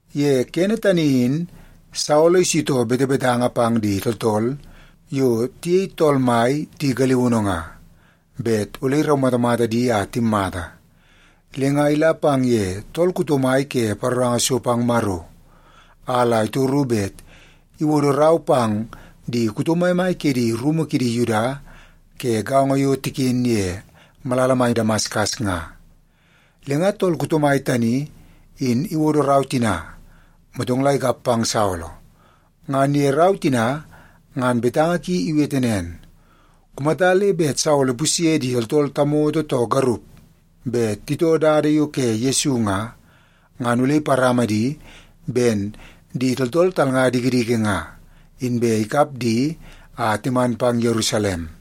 Ye kene tani in Saolo isitoo betebetanga pang di tooltool yo tiyei Tool Mai di galiunu nga, bet ole iraumatamata di a timmata. Le nga ila pang ye tool kuto mai ke paroranga so pang Maro, a la itoru bet iwodo rau pang di kuto maimai ke di rumu kidi Yuda ke gaongo yo tiken ye malala mai Damaskas nga. Le nga tool kuto mai tani in iwodo rau tina, motong la ikap pang Saolo. Ngan ye rau tina ngan betanga ki iwete nen, “Kumata le bet Saolo ipusye di tooltool tamoto too garup bet itoo Dada yo ke Yesu nga, ngan ole iparama di ben di tooltool talnga dikidiki nga, inbe ikap di a timan pang Yerusalem.”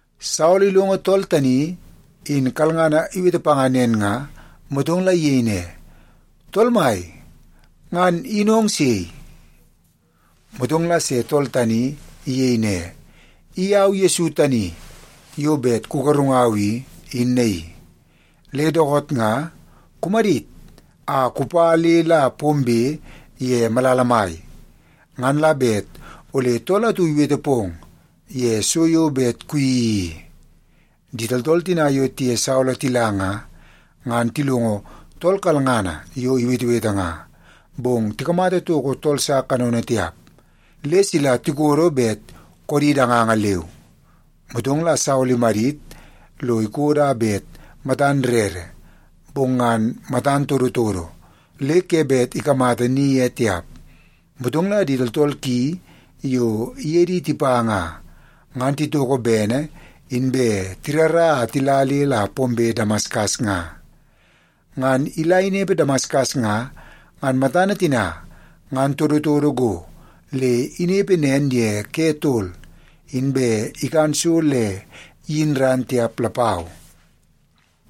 Saolo ilongo tool tani in kalngana iwete panga nen nga, motong la iyei ne, “Tool Mai, ngan in ong sei?” Motong la se tool tani iyei ne, “I au Yesu tani yo bet kugarungau i, in naii. Le dookoot nga kumadit a kupa le la pombe ye malala mai. Ngan la bet ole tool atu iwete pong ye so yo bet kuyeii i.” Di tooltool tina yo tiye Saolo tila nga, ngan tilongo tool kalngana yo iwetewete nga, bong tikamata toko tool sa kanono tiap, le sila tikodo bet koodi danganga leu. Motong la Saolo imadit lo ikodo a bet matan rere, bong ngan matan todotodo le ke bet ikamata ni ye tiap. Motong la di tooltool ki yo iye di tipa nga, ngan titoko bene inbe tirara a tila le la pombe Damaskas nga. Ngan ila inepe Damaskas nga, ngan matana tina ngan todotodo go le inepe nen ye ke tol, inbe ikan so le iyin ran tiap lapau.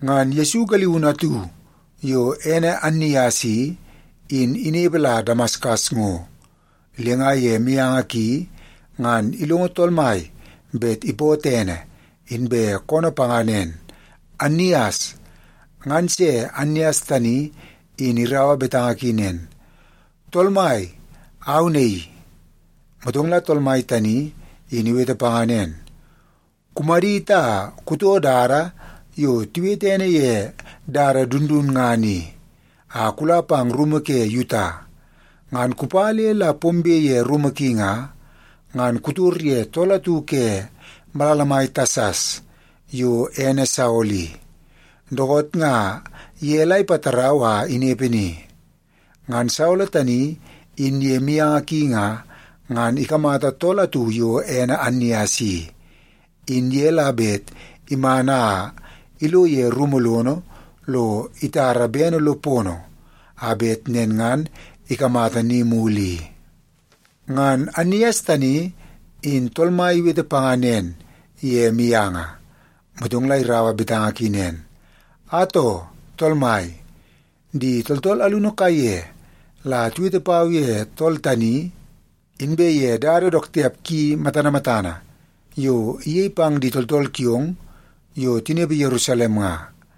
Ngan Yesu galiunu atu yo ene Annias i, in inepe la Damaskas ngo. Le nga ye mianga ki ngan ilongo Tool Mai bet ipootoo ene, inbe koonoo panga nen, “Annias.” Ngan se Annias tani in iraua betanga ki nen, “Tool Mai, au naii.” Motong la Tool Mai tani in iwete panga nen, “Kumadit a kutoo dada yo tiwete ene ye Dada Dundunngana i a kula pang rumu ke Yuta. Ngan kupa le la pombe ye rumu ki nga, ngan kutor ye tool atu ke malala mai Tasas yo ene Saolo i. Dookoot nga ye la ipatarau a inepe ni. Ngan Saolo tani in ye mianga ki nga, ngan ikamata tool atu yo ene Annias i, in ye la bet iman a ilo ye rumu lono lo itara bene lo pono, a bet nen ngan ikamata ni mulu i.” Ngan Annias tani in Tool Mai iwete panga nen ye mianga, motong la iraua betanga ki nen, “Atoo, Tool Mai, di tooltool alunu kaiye la tiwete pau ye tool tani, inbe ye dada dook tiap ki matana matana yo iyei pang di tooltool kiong yo tinepe Yerusalem nga.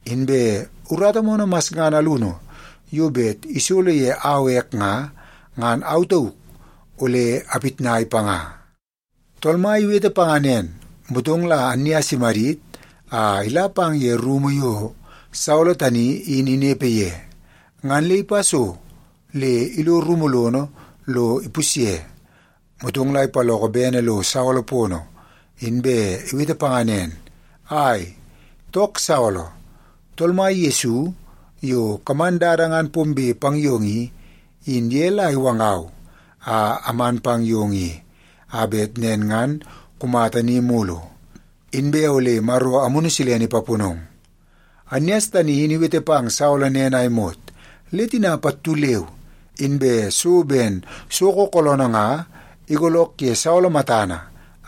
Inbe urata moonoo masngana alunu yo bet isolo ye au ek nga, ngan au tauk ole apitnai panga.” Tool Mai iwete panga nen, motong la Annias imadit a ila pang ye rumu yo Saolo tani in inepe ye, ngan le ipa so le ilo rumu lono lo ipusye. Motong la ipaloko bene lo Saolo pono, inbe iwete panga nen, “Ai, took Saolo! Tool Mai Yesu yo kaman dada ngan pombe pang yong i, in ye la iwangau a aman pang yong i, a bet nen ngan kumata ni mulu, inbe ole Maro Amunu Silene ipaponong.” Annias tani in iwete pang Saolo nen a imot, le tina pattu leu inbe so ben soko kooloonoo nga igoolook ye Saolo matana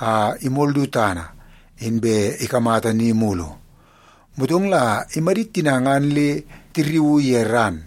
a imol du tana, inbe ikamata ni mulu. Motong la imadit tina ngan le tirriuu ye ran,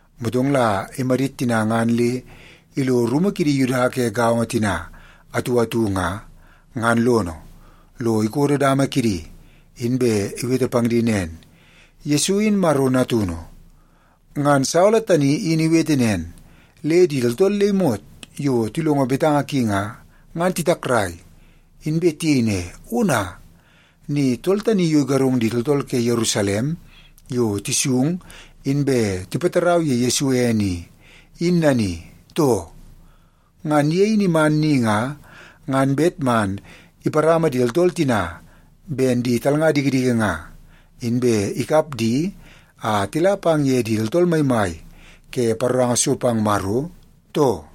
Motong la imadit tina ngan le ilo rumu kidi Yuda ke gaongo tina atu atu nga, ngan lono, lo ikodo dama kidi, inbe iwete pang di nen, “Yesu in Maro Natunu.” Ngan Saolo tani in iwete nen, le di tooltool le imot yo tilongo betanga ki nga, ngan titakrai. Inbe tiyei ne, “Ona, ni tool tani yo igarung di tooltool ke Yerusalem yo tisung inbe tipatarau ye Yesu ene i, in nani, too? Ngan ye in iman ni nga, ngan bet man iparama di tooltool tina ben di talnga dikidiki nga, inbe ikap di a tila pang ye di tooltool maimai ke paroranga so pang Maro, too?”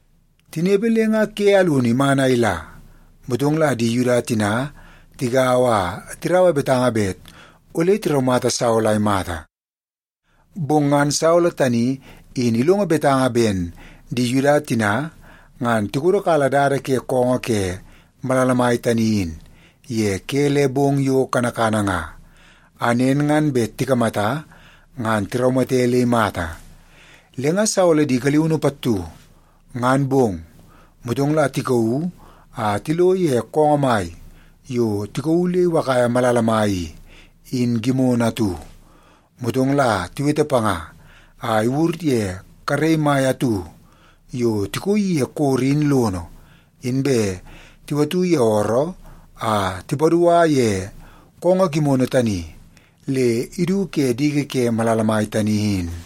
Tinepe le nga ke alunu iman a ila, motong la di Yuda tina tigaua a tiraua betanga bet ole tiraumata Saolo a imata. Bong ngan Saolo tani in ilongo betanga ben di Yuda tina, ngan tikodokala dada ke koongoo ke malala mai tani in ye ke le bong yo kanakana nga, a nen ngan bet tikamata ngan tiraumate le imata. Le nga Saolo di galiunu pattu, ngan bong, motong la tikauu a tilo ye koongoo mai yo tikauu le iwakaia malala mai i, in gimono atu. Motong la tiwete panga a iwur ye karei mai atu yo tikooi ye koro in lono, inbe tiwatu ye ooroo a tipadua ye koongoo gimono tani le idu ke diki ke malala mai tani in.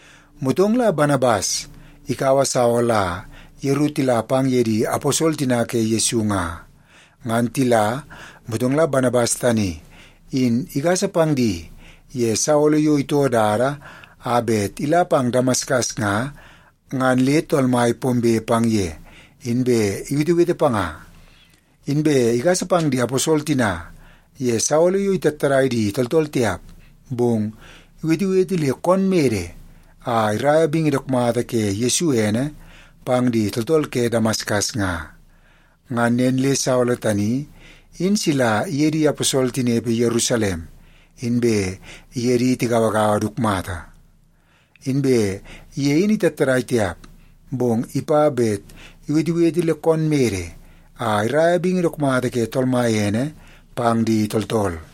Motong la Banabas ikaua Saolo a yeru tila pang ye di aposol tina ke Yesu nga. Ngan tila, motong la Banabas tani in igasa pang di ye Saolo yo itoo dada a bet ila pang Damaskas nga, ngan le Tool Mai pombe pang ye, inbe iwetewete panga. Inbe igasa pang di aposol tina ye Saolo yo itattadai di tooltool tiap, bong iwetewete le koon mede a iraia bingi dook mata ye Yesu ene pang di tooltool ke Damaskas nga. Ngan nen le Saolo tani in sila iye di aposol tinepe Yerusalem, inbe iye di tigauagaua dook mata. Inbe ye in itattadai tiap, bong ipa bet iwetewete le koon mede a iraia bingi dook mata ke Tool Mai ene pang di tooltool.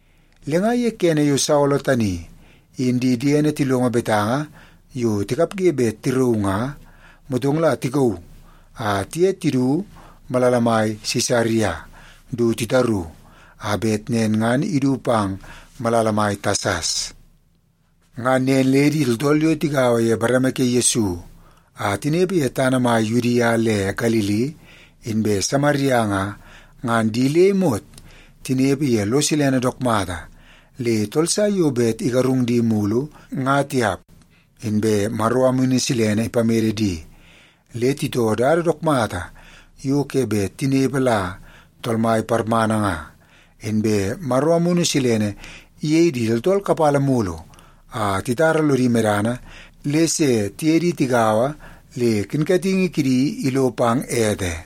Le nga ye kene yo Saolo tani in di diene tilongo betanga yo tikapge bet tirauu nga, motong la tikauu a tiye tidu malala mai Sisaria du titaru, a bet nen ngan idu pang malala mai Tasas. Ngan nen le di tooltool yo tigaua ye bareme ke Yesu a tinepe ye tana mai Yudia le Galili inbe Samaria nga, ngan di le imot tinepe ye lo silene dook mata. Le tool sa yo bet igarung di mulu, nga tiap, inbe Maro Amunu Silene ipamede di, le titoo dada dook mata yo ke bet tinepe la Tool Mai parmana nga. Inbe Maro Amunu Silene iyei di tooltool kapala mulu a titara lodi medana le se tiye di tigaua le kinkatingi kidi ilo pang ete.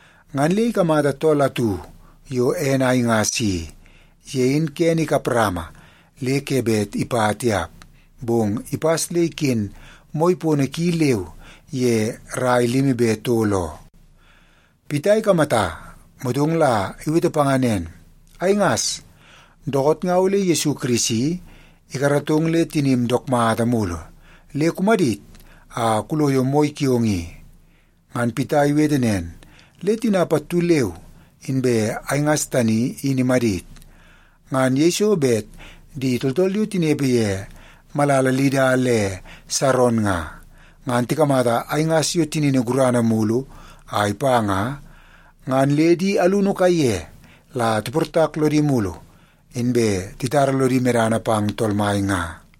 Ngan le ikamata tool atu yo ene Aingas i. Ye in kene ikap rama le ke bet ipa tiap, bong ipas le iken moi pono ki leu ye rai limi be tol oo. Pita ikamata, motong la iwete panga nen, “Aingas, dookoot nga ole Yesu Kirisi ikaratong le tinim dook mata mulu. Le kumadit a kuloyo moi kiong i.” Ngan Pita iwete nen, le tina pattu leu inbe Aingas tani in imadit. Ngan yeiso bet di tooltool yo tinepe ye malala Lida le Saron nga, ngan tikamata Aingas yo tinini gurana mulu a ipa nga, ngan le di alunu kaiye la tiportak lodi mulu, inbe titara lodi medana pang Tool Mai nga.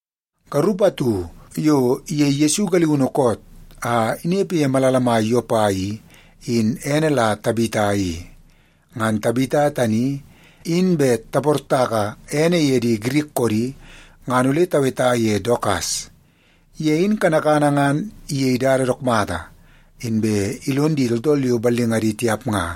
Garup atu yo iyei Yesu galiunu koot a inepe ye malala mai Yopa i, in ene la Tabita i. (Ngan Tabita tani in bet taportaka ene ye di Girik koodi, ngan ole taweta ye Dokas). Ye in kanakana ngan iyei dada dook mata, inbe ilon di tooltool yo ballingadi tiap nga.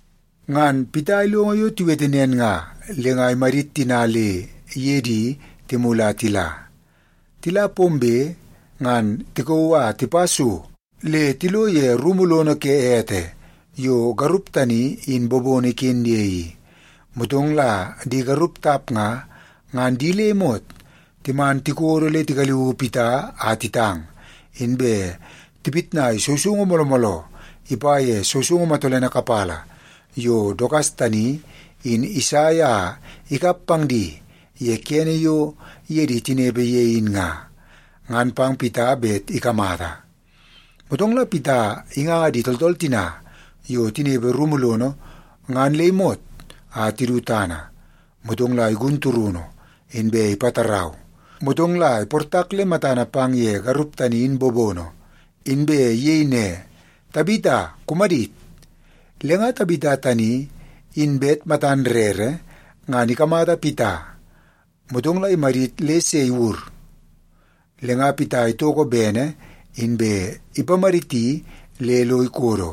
Ngan Pita ilongo yo tiwete nen nga, le nga imadit tina le iye di timulu a tila. Tila pombe, ngan tikauu a tipa so le tilo ye rumu lono ke ete yo garup tani in bobono iken ye i. Motong la di garup tap nga, ngan di le imot timan tikodo le tigaliui Pita a titang, inbe tipitnai sousoungu mooloo mooloo ipa ye sousoungu matolene kapala yo Dokas tani, in isai a ikap pang di ye kene yo iye di tinepe ye in nga, ngan pang Pita bet ikamata. Motong la Pita inganga di tooltool tina yo tinepe rumu lono ngan le imot a tidu tana. Motong la igun turunu, inbe ipatarau. Motong la iportak le matana pang ye garup tani in bobono, inbe iyei ne, “Tabita, kumadit!” Le nga Tabita tani, in bet matan rere ngan ikamata Pita, motong la imadit le se iwur. Le nga Pita itoko bene, inbe ipamaditi le lo ikodo.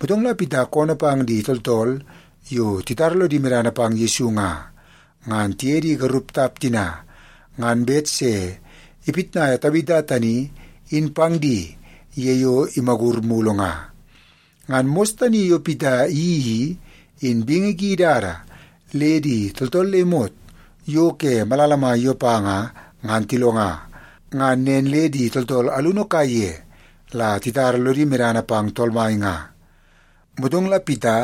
Motong la Pita koonoo pang di tooltool yo titara lodi medana pang Yesu nga, ngan tiye di garup tap tina ngan bet se ipitnaia Tabita tani in pang di ye yo imagur mulu nga. Ngan mos tani yo Pita iyeii i, in bingi ki idada le di tooltool le imot yo ke malala mai Yopa nga, ngan tilonga. Ngan nen le di tooltool alunu kaiye la titara lodi medana pang Tool Mai nga. Motong la Pita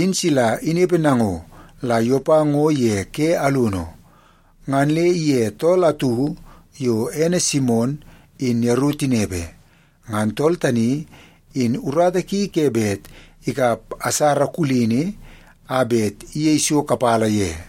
in sila inepe nango la Yopa ngo ye ke alunu. Ngan le iye tool atu yo ene Simon in yeru tinepe. Ngan tool tani in urata ki ke bet ikap asara kulini a bet iyei so kapala ye.